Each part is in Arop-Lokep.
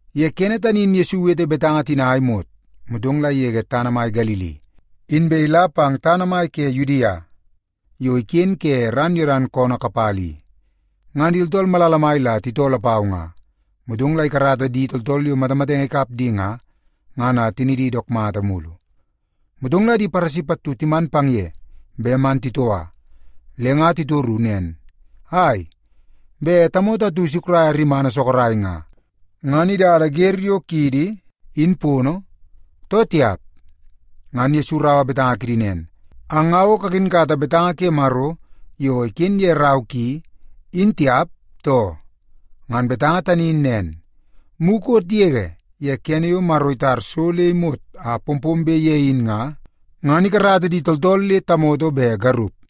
Ye kene tani in Yesu iwete betanga tina a imot, motong la igege tana mai Galili, inbe ila pang tana mai ke Yudia yo iken ke ran Yodan koonoo kapala i. Ngan di tooltool malala mai la titoo lapau nga, motong la ikarata di tooltool yo matamatenge ikap di nga, ngan le tinidi dook mata mulu. Motong la di Paresi pattu timan pang ye bet man titoua. Le nga titoru nen, “Ai, bet tamoto atu isukraia rimana sorok nga, ngan idada wer yo kiidi in pono, too tiap?” Ngan Yesu iraua betanga kidi nen, “Ang nga o kakinkata betanga ke Maro yo iken ye rau ki, in tiap, too? Ngan betanga tani in nen, mukot yege ye kene yo Maro itar so le imot a pompombe ye in nga, ngan ‘ikarata di tooltool le tamoto be garup.’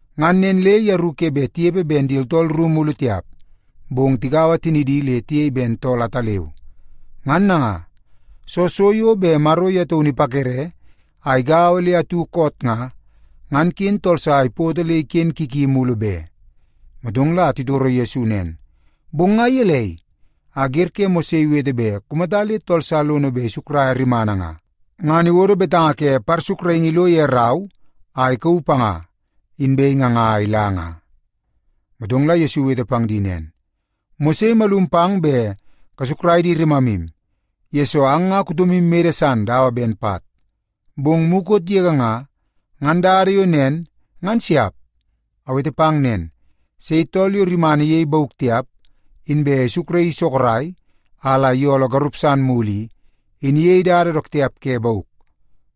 Ngan nen le yeru ke bet tinepe ben di tooltool ru mulu tiap, bong tigaua tinidi le tiyei ben tool ataleu. Ngan nanga, soo so yo bet Maro ye taunu ipakere a igaua le atu koot nga, ngan ken tool sa ipoto le iken ki ki mulu be.” Motong la titoro Yesu nen, “Bong nga gelei, a wer ke Mose iwete bet kumata le tool sa lono bet isukraia rimana nga, ngan iwodo betanga ke parsukraingi ilo ye rau a ikauu panga, inbe inganga a ila nga?” Motong la Yesu iwete pang di nen, “Mose imalum pang bet kasukrai di rimamu, yesoo ang nga kutomu mede san dawa ben pat. Bong mukot yege nga, ngan dada yo nen, ngan siap. Awete pang nen, sei tool yo rimana iyei bauk tiap, inbe isukraii sorok a la iyooloo garup san mulu i, in iyei dada dook tiap ke bauk.”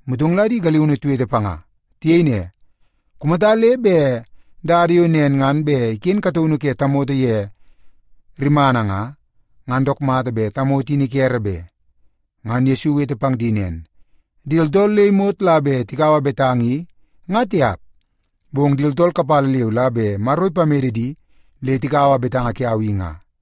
Motong la di galiunu tiwete panga. Tiyei ne, “Kumata le bet dada yo nen ngan bet iken kataunu ke tamoto ye rimana nga, ngan dook mata bet tamoto in ikere be.” Ngan Yesu iwete pang di nen, “Di tooltool le imot la bet tikaua betanga i nga tiap, bong di tooltool kapala leu la bet Maro ipamede di le tikaua betanga kiau i nga.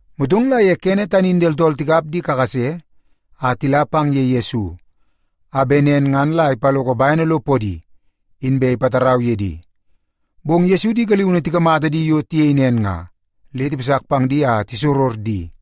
Motong la ye kene tani in di tooltool tikap di kakase a tila pang ye Yesu, a bet nen ngan la ipaloko bene lo podi, inbe ipatarau ye di. Bong Yesu di galiunu tikamata di yo tiyei nen nga, le tipasak pang di a tisoror di.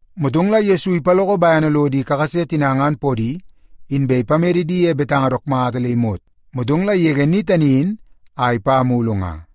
Motong la Yesu ipaloko bene lo di kakase tina ngan podi, inbe ipamede di ye betanga dook mata le imot, motong la igege ni tani in a ipa mulu nga.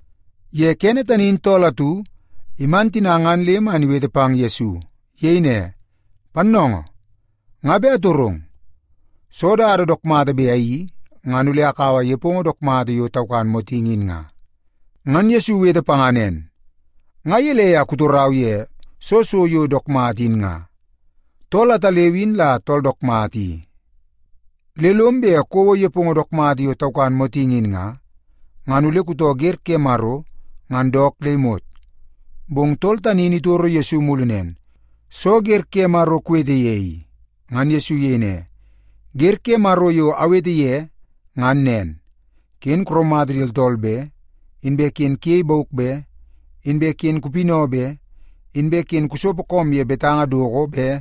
Ye kene tani in tool atu iman tina ngan le man iwete pang Yesu. Iyei ne, “Pannoongoo, nga bet atorong. Soo dada dook mata bet ayeii, ngan ole akaua nepongo dook mata yo taukan motingi in nga?” Ngan Yesu iwete panga nen, “Nga gelei a kutorau ye soo so yo dook mata in nga? Tool ataleu in la tool dook mata i. Le lom bet kouo nepongo dook mata yo taukan motingi in nga, ngan ole kutoo wer ke Maro ngan dook le imot.” Bong tool tani in itoro Yesu mulu nen, “Soo wer ke Maro kuwete ye i?” Ngan Yesu iyei ne, “Wer ke Maro yo awete ye ngan nen: ‘Ken kuraumata di tooltool be; inbe ken kuyei bauk be; inbe ken kupinau be; inbe ken kusopo koom ye betanga doko be;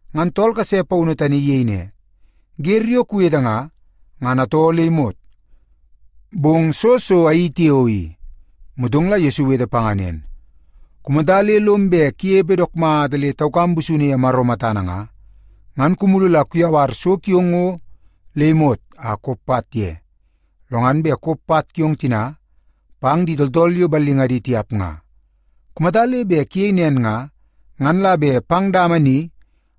Ngan tool kase paunu tani iyei ne, “Wer yo kuwete nga, ngan atoo le imot. Bong soo so ayeii tiao i?” Motong la Yesu iwete panga nen, “Kumata le lom bet kunepe dook mata le taukam busunu ye Maro matana nga, ngan kumulu la kuyawar so kiong ngo le imot a kop pat ye, lo ngan bet kop pat kiong tina pang di tooltool yo ballingadi tiap nga. Kumata le bet kuyei nen nga, ngan la bet pang dama ni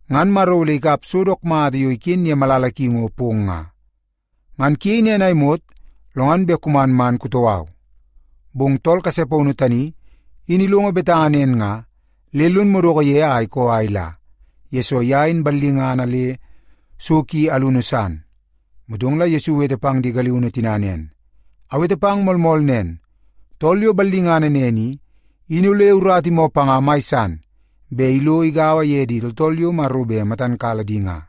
ngan Maro ole ikap so dook mata yo iken ye malala ki ngo pong nga. Ngan kuyei nen a imot, lo ngan bet kuman man kutoo au.” Bong tool kase paunu tani in ilongo betanga nen nga, le lon madoko ye a ikoo a ila, yesoo ye in ballingana le so ki alunu san. Motong la Yesu iwete pang di galiunu tina nen, “Awete pang moolmool nen, tool yo ballingana nen i, in ole urata imoo panga mai san bet ilo igaua ye di tooltool yo Maro bet matan kala di nga.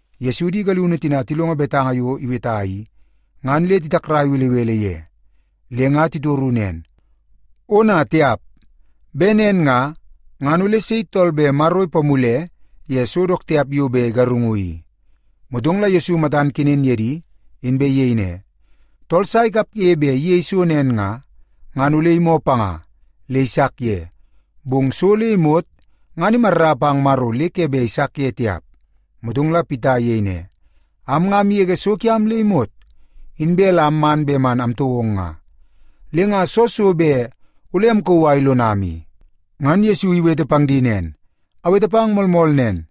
Yesu di galiunu tina tilongo betanga yo iweta i, ngan le titakrai belebele ye. Le nga titoru nen, “Ona tiap! Bet nen nga, ngan ole sei tool bet Maro ipamule ye so dook tiap yo bet igarungu i?” Motong la Yesu matan kenen ye di, inbe iyei ne, “Tool sa ikapge bet iyei so nen nga, ngan ole imoo panga le isak ye, bong so le imot ngan imarra pang Maro le ke bet isak ye tiap.” Motong la Pita iyei ne, “Am nga amgege so kiam le imot, inbe la amman bet man amtoo ong nga. Le nga soo so bet ole amkauu a ilonam i?” Ngan Yesu iwete pang di nen, “Awete pang moolmool nen.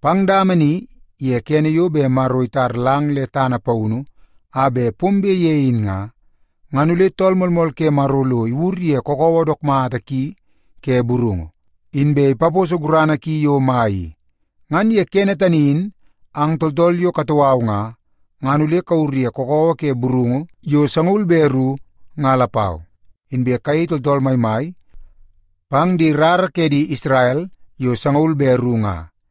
Pang dama ni ye kene yo bet Maro itar lang le tana paunu a bet pombe ye in nga, ngan ole Tool Moolmool ke Maro lo iwur ye kakawa dook mata ki ke burungu, inbe ipaposo gurana ki yo mai i. Ngan ye kene tani in ang tooltool yo katoo au nga, ngan ole kawur ye kakawa ke burungu yo sangaul be ru nga lapau, inbe kayei tooltool maimai pang di rara ke di Isrel yo sangaul be ru nga.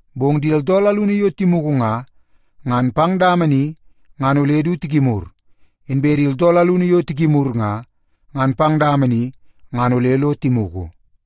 Bong di tooltool alunu yo timugu nga, ngan pang dama ni ngan ole du tikimur. Inbe di tooltool alunu yo tikimur nga, ngan pang dama ni ngan ole lo timugu.”